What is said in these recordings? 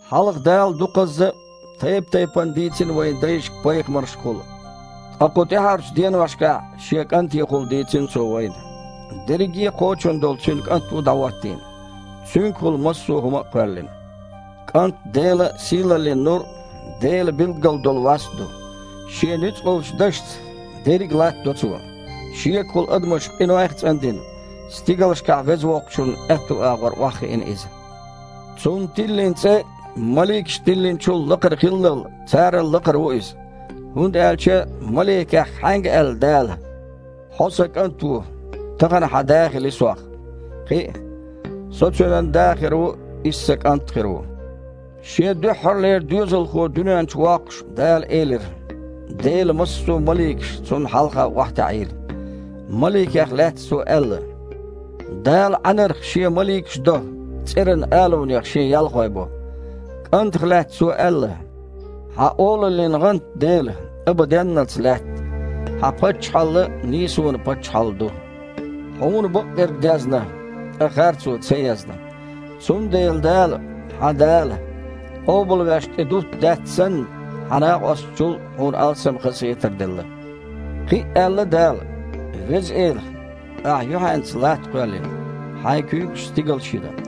Хьалха Дала дукхазза а, тайп-тайпана а дийцина вайн дайшка пайхамаршкахула, ткъа кху тІаьхьарчу деношкахь Шен КІантехула дийцина Цо вайна. Дерриге а кхочун долу Цуьнан КІант ву дІахІоттийна. Цуьнгахула массо хІума а кхоьллина. КІант Делан сийлаллин нур а, Делан билггал долу васт а ду. Шен нуьцкъалчу Дашца дерриг а латтадо Цо. Шегахула адамаш къинойх а цІандина, стигалшкахь Веза Воккхачунна аьтту агІор охьахиина Иза. Цунна тиллина цІе маликашна тиллинчул лакхара хиллал, царал лакхара ву Иза. ХІунда аьлча Маликех хьаьнга аьлла Дала: «Хьо Сан КІант ву, тахана Сох Хьан Да хилла»? Кхин а: «Со Цуьнан Да хир ву, Иза Сан КІант а хир ву?» Шен дуьххьарлера Доьзалхо дуьнен чу воккхуш, Дала элира: «Делан массо а маликаш Цунна хьалха охьатаьІийла». Маликех лаьцна Цо аьлла: «Дала Іаьнарх Шен маликаш до, цІеран алунех Шен ялхой бо». КІантах лаьцна Цо аьлла: «Хьан олаллин гІант, Дела, абаденналц лаьтта, Хьан паччахьалла нийсонан паччахьалла ду. Хьуна бакъдерг дезна, ткъа харцо ца езна, цундела Дала, Хьан Дала, къобалвеш тІедутту даьтта санна, Хьан накъосташна чул Хьуна алсам хазахетар делла». Кхин а аьлла Дала: «Веза Эла, Ахь юьхьанца латта кхоьллина, Хьайн куьйгашца стигал а йина.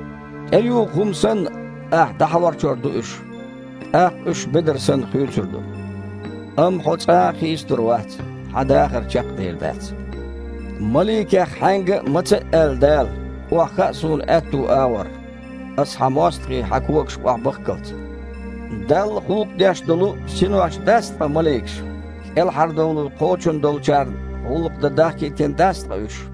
ТІеюху хІума санна, Ахьа дІахьарчор ду уьш, тІаккха уьш, бедар санна, хуьйцур ду. Амма Хьо цкъа а хийцалур вац, Хьан дахар чекх а дер дац». Маликех хьаьнга а, маца а аьлла Дала: «Охьахаа Суна аьтту агІор, Аса Хьан мостагІий Хьан когашка охьабахккалц»? Далла гІуллакх деш долу синош дац ткъа маликаш, кІелхьардовлар кхочун долчарна гІуллакх дан дахкийтина дац ткъа уьш?